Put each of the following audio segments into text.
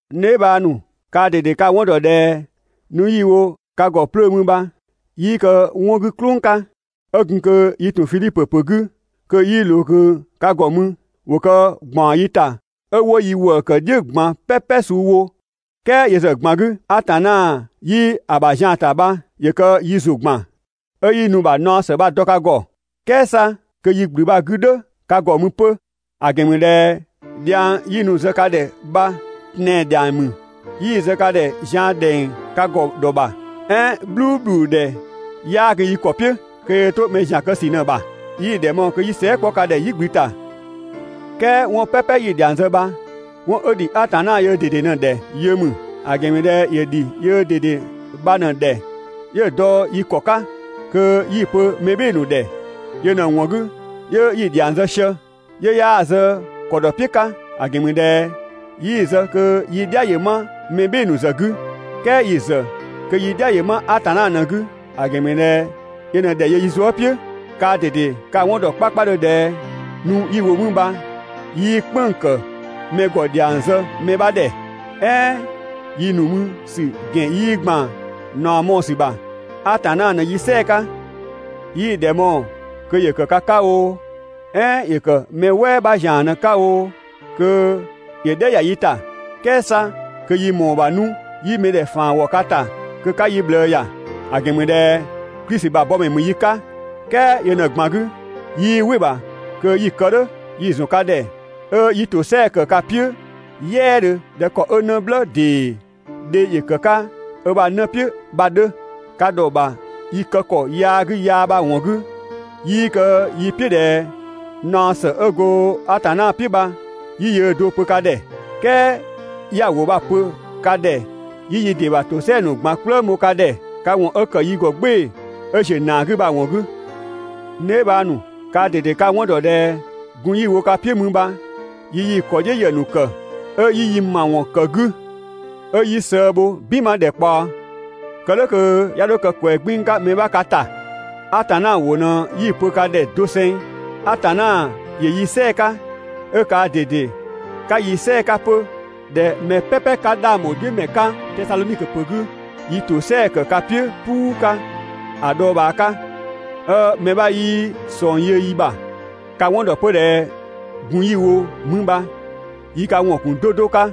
N dheebhang ‑nu, kaa ꞊dede ka‑ 'wɔn ‑dɔ ꞊dhɛ nu 'yi‑ wo ka ‑gɔ 'plöö mü bha, 'yii kë 'wɔn 'gü "klʋng 'ka. 'Ö gun kö yi ‑tun Fidhipö ‑pö 'gü kö 'yii ꞊loo ꞊kö ka ‑gɔ mü, ‑wo kë ‑gbaɔn yi ta 'ö 'wo yi ‑wëë ‑kë "dhiʋ̈ ꞊gban "pɛpɛ suu wo, "kɛɛ yö ‑zë ꞊gban 'gü, Atanna 'yi‑ ‑bha zian ‑ta bha ‑yö kë yi ‑zʋ ‑gban 'ö 'yi nu‑ ‑bha naɔ ‑së bha‑ dɔ ka ‑gɔ, "kɛɛ 'sa kö yi ‑gblü bha‑ 'gü "dhʋ̈ ka ‑gɔ mü 'pö. ‑A ‑gɛn ‑mü ꞊dhɛ dhiang 'yi nu‑ zë ka ‑dhɛ bha tɛan‑ ‑dhiang ‑mü. 'Yii‑ ‑zë ka ‑dhɛ zian ‑dhɛng ka ‑gɔ ‑dhɔ ‑bha, "ɛɛn "bhluubhludhɛ 'yaa gun yi ‑kɔ "piʋ̈, kö yöö 'to mɛ ‑zian kë ‑sü ꞊në‑ ‑bha. 'Yii‑ ‑dhɛ mɔɔ‑ kö 'yi sɛɛ" 'kpɔ ka ‑dhɛ "yigblü ‑ta. "Kɛɛ 'wɔn "pɛpɛ 'yi‑ ‑dhiang zë bha, 'wɔn 'ö ‑dhi Atanna yöö ꞊dede ꞊në‑ ‑dhɛ yö ‑mü. ‑A ‑gɛn ‑mü ꞊dhɛ ‑yö ‑dhi yöö ꞊dede bha ꞊në‑ ‑dhɛ, 'yö‑ dɔ yi ‑kɔ 'ka kö 'yi‑ pö mɛ "bhɩɩ‑ ‑nu ‑dhɛ. Yö ꞊në‑ ‑wɔn 'gü, 'yö 'yi‑ ‑dhiang zë sië, 'yö 'yaa‑ zë ‑kɔdɔ "piʋ̈ 'ka, ‑a ‑gɛn ‑mü ꞊dhɛ 'yii‑ zë kö yi "dhia ‑yö 'ma mɛ "bhɩɩ‑ ‑nu ‑zë 'gü, "kɛɛ yi ‑zë kö yi "dhia‑ ma Atanna ꞊në‑ 'gü. ‑A ‑gɛn ‑mü ꞊dhɛ yö ꞊në ‑dhɛ ‑yö yi zuë" "piʋ̈. Kaa ꞊dede ka‑ 'wɔn ‑dɔ 'kpakpadhö ꞊dhɛ nu 'yi‑ wo mü bha 'yii "kpënng‑ ‑kë mɛ ‑gɔ ‑dhiang zë mɛ 'bha ‑dhɛ, "ɛɛn yi ‑nu mü ‑sü ‑gɛn 'yii ‑gban ꞊naɔ mɔɔ‑ ‑sü ‑bha, Atanna ꞊në yi "sɛɛ 'ka. 'Yii‑ ‑dhɛ mɔɔ‑ kö ‑yö ‑kë ka 'ka oo, "ɛɛn ‑yö ‑kë mɛ "wɛɛ 'bha ‑zian ꞊në‑ 'ka oo, kö ‑yö "dhɛ ‑ya yi ‑ta, "kɛɛ 'sa kö yi ‑mɔɔ ‑bha 'nu 'yi mɛdhɛ ‑faan ‑wɔ ka ‑ta kö 'ka yi ꞊bhlëë ‑ya; ‑a ‑gɛn ‑mü ꞊dhɛ Klisi ‑bha bɔmɛ ‑mü yi 'ka. "Kɛɛ yö ꞊në ꞊gban 'gü, 'yii "wɩ‑ ‑bha kö 'yi‑ kë "dhʋ̈. Yi ‑zɔn ka ‑dhɛ 'ö 'yi ‑tosɛa ‑kë ka "piʋ̈ "yɛɛdhö ꞊dhɛ ‑kɔ 'ö 'në "blë ‑dee dhe ‑yö ‑kë 'ka ö ‑bha 'në "piʋ̈ bha‑ 'dhö. Ka ‑dhɔ ‑bha yi kë ‑kɔ yaa 'gü yaa bha‑ ‑wɔn 'gü, 'yii kë yi "piʋ̈ ꞊dhɛ naɔ ‑së 'ö go Atanna "piʋ̈ bha 'yi yöö do‑ pö ka ‑dhɛ, "kɛɛ 'ya‑ ‑wʋ bha‑ pö ka ‑dhɛ 'yi yi ‑dɩ ‑bha ‑tosɛa ‑nu ꞊gban "kplëng ‑bho ka ‑dhɛ, ka ‑wɔn 'ö ‑kë yi ‑gɔ "gbɩɩ‑ 'ö ‑ziö ‑naa 'gü bha‑ ‑wɔn 'gü. N dheebhang ‑nu, kaa ꞊dede ka‑ 'wɔn ‑dɔ ꞊dhɛ gun 'yi‑ wo ka "piʋ̈ mü bha yi yii‑ ‑kɔdhiʋ̈ ‑yë ‑nu ‑kë 'ö 'yi yi ‑mawɔn ‑kë 'gü, 'ö 'yi sëë bho "binma ‑dhɛkpaɔ, kë "dhʋ̈ kö 'ya 'dho kë ꞊kwɛɛ‑ 'gbiin‑ 'ka mɛ 'bha ka ‑ta. Atanna ‑wʋ ꞊në 'yi‑ pö ka ‑dhɛ doseng. Atanna ‑yö yi "sɛɛ‑ 'ka, 'ö kaa ꞊dede 'ka yi "sɛɛ‑ 'ka 'pö ꞊dhɛ mɛ "pɛpɛ 'ka 'dhang ‑bho "dhiʋ̈ ‑mɛ 'ka Tesadhonikö ‑pö 'gü, yi ‑tosɛa ‑kë ka "piʋ̈ "puu 'ka ‑a dhɔɔbhaa 'ka, 'ö mɛ 'bha 'yii ꞊sɔng yö yi ‑bha. Ka‑ 'wɔn ‑dɔ 'pö ꞊dhɛ gun 'yi‑ wo mü bha yi ka ‑wɔn ‑kun 'do 'do 'ka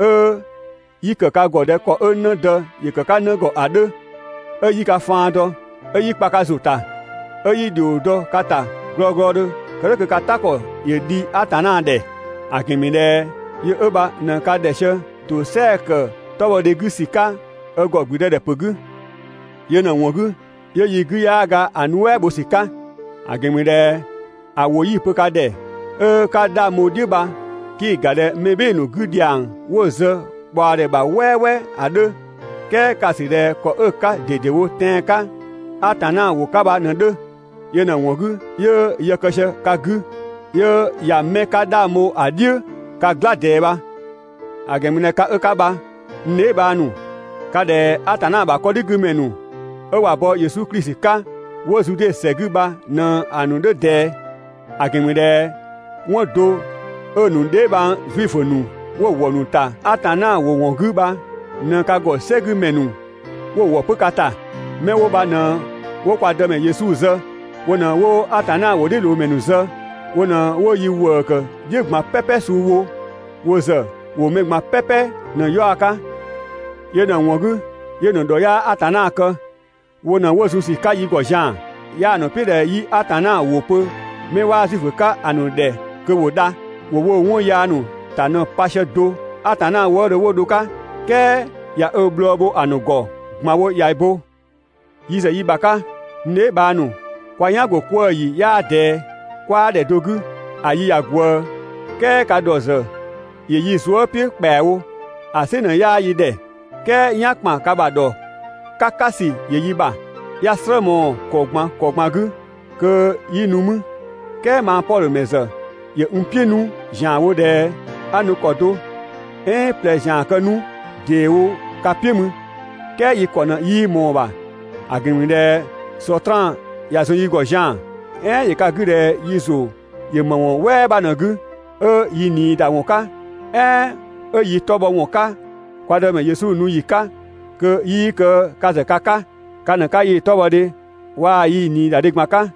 'ö 'yi ‑kë ka ‑gɔ ꞊dhɛ ‑kɔ 'ö 'në dë ‑yö ‑kë 'ka 'në ‑gɔ ‑a 'dhö. 'Ö 'yi ka faan dɔ, 'ö 'yi kpa ka ‑zʋ ‑ta, 'ö 'yi ‑dhio dɔ ka ‑ta glɔglɔdhö kë "dhʋ̈ kö ka "ta ‑kɔ ‑yö dhi Atanna ‑dhɛ; ‑a ‑gɛn ‑mü ꞊dhɛ yö 'ö bha ꞊në ka ‑dhɛ sië ‑tosɛa ‑kë 'tɔbhɔdhe 'gü ‑sü 'ka ö ‑gɔ ‑gblüdëdhɛpö 'gü. Yö ꞊në‑ ‑wɔn 'gü 'yö yi 'gü 'yaa ga‑ nuɛ" bho ‑sü 'ka, ‑a ‑gɛn ‑mü ꞊dhɛ ‑a ‑wʋ 'yi‑ pö ka ‑dhɛ 'ö 'ka 'dhang bho‑ "dhiʋ̈ bha, 'kii‑ ‑ga ꞊dhɛ mɛ "bhɩɩ‑ ‑nu 'gü ‑dhiang 'wo‑ zë ꞊kpaɔdhɛ ‑bha "wɛɛwɛɛ ‑a 'dhö, "kɛɛ ka‑ ‑sü ꞊dhɛ ‑kɔ 'ö‑ 'ka ꞊dedewo tɛan‑ 'ka Atanna ‑wʋ 'ka bha ꞊në‑ 'dhö. Yö ꞊në‑ ‑wɔn 'gü 'yö yë kë sië ka 'gü, 'yö ꞊ya 'mɛ 'ka 'dhang bho ‑a "dhiʋ̈ ka "gla ꞊dɛɛ bha. ‑A ‑gɛn ‑mü ꞊dhɛ ka 'ö 'ka bha, n dheebhang ‑nu, ka ꞊dhɛ Atanna ‑bha 'kɔdhigümɛ ‑nu 'ö ꞊wa bɔ Yesu Klisi 'ka, 'wo Zude ‑sɛ 'gü bha ꞊në‑ ‑nu 'dhö ꞊dɛɛ. ‑A ‑gɛn ‑mü ꞊dhɛ 'wɔn do 'ö‑ ‑nu dheebhang Zuifö ‑nu 'wo‑ ‑wɔ ‑nu ‑ta Atanna ‑wʋ ‑wɔn 'gü bha ꞊në ka ‑gɔ "sɛgümɛ ‑nu 'wo‑ ‑wɔ 'pö ka ‑ta. 'Mɛ 'wo bha ꞊në 'wo kwa Dëmɛ Yesu zë, wo ꞊në 'wo Atanna ‑wʋdhiʋ̈loomɛ ‑nu zë, 'wo ꞊në 'wo yi ‑wëë ‑kë "dhiʋ̈ ꞊gban "pɛpɛ suu wo. Wo ‑zë ‑wo mɛ ꞊gban "pɛpɛ ꞊në‑ 'yaɔ‑ 'ka. Yö ꞊në‑ ‑wɔn 'gü 'yö‑ ‑nu ‑dhɔ 'yaa Atanna kë. Wo ꞊në 'wo zun ‑sü 'ka yi ‑gɔ zian‑. 'Yaa‑ ‑nu "piʋ̈ ꞊dhɛ 'yi Atanna ‑wʋ pö 'mɛ 'waa Zuifö 'ka‑ ‑nu ‑dhɛ kö ‑wo dha. ‑Wo woo 'wɔn yaa ‑ta ꞊në pa sië do Atanna wëëdhö 'wo dho‑ 'ka. "Kɛɛ ꞊ya ö bhlɔɔ bho‑ ‑nu ‑gɔ ꞊gban wo ꞊ya bo. Yi ‑zë yi ‑bha 'ka, n dheebhang ‑nu, kwa "yan ‑go 'kwëë‑ ‑yi 'yaa ꞊dɛɛ, 'kwaa ‑dhɛ do 'gü ‑a yi ꞊ya ꞊gwëë, "kɛɛ ka ‑dhɔ ‑zë ‑yö yi zuë" "piʋ̈ ‑kpɛawo. ‑A "sɩ ꞊në 'yaa yi ‑dhɛ, "kɛɛ "yan ‑kpan ka ‑bha ‑dhɔ "kakasü ‑yö yi ‑bha. 'Ya‑ "slë mɔɔ‑ ‑kɔ ꞊gban ‑kɔ ꞊gban 'gü kö 'yi nu mü, "kɛɛ mang Pɔdhö ‑mɛ ‑zë ‑yö n "piʋ̈ 'nu ‑zianwo ꞊dhɛ 'a nu ‑kɔ do "ɛɛn ꞊plɛ ‑zian kë 'nu ‑deewo ka "piʋ̈ mü, "kɛɛ yi ‑kɔ ꞊në 'yii ꞊mɔɔ‑ ‑bha. ‑A ‑gɛn ‑mü ꞊dhɛ Sɔtraan ꞊ya zun yi ‑gɔ zian‑. "Ɛɛn ‑yö ka 'gü ꞊dhɛ yi ‑zʋ ‑yö ‑më ‑wɔn "wɛɛ 'bha ꞊në‑ 'gü, 'ö yi ꞊nii ‑da ‑wɔn 'ka, "ɛɛn 'ö yi 'tɔ bhɔ ‑wɔn 'ka kwa Dëmɛ Yesu nu ‑yi 'ka kö 'yii kë ka ‑zë ka 'ka? Ka ꞊në 'ka yii‑ 'tɔbhɔdhe waa‑ yii‑ ꞊niidadhe ꞊gban 'ka.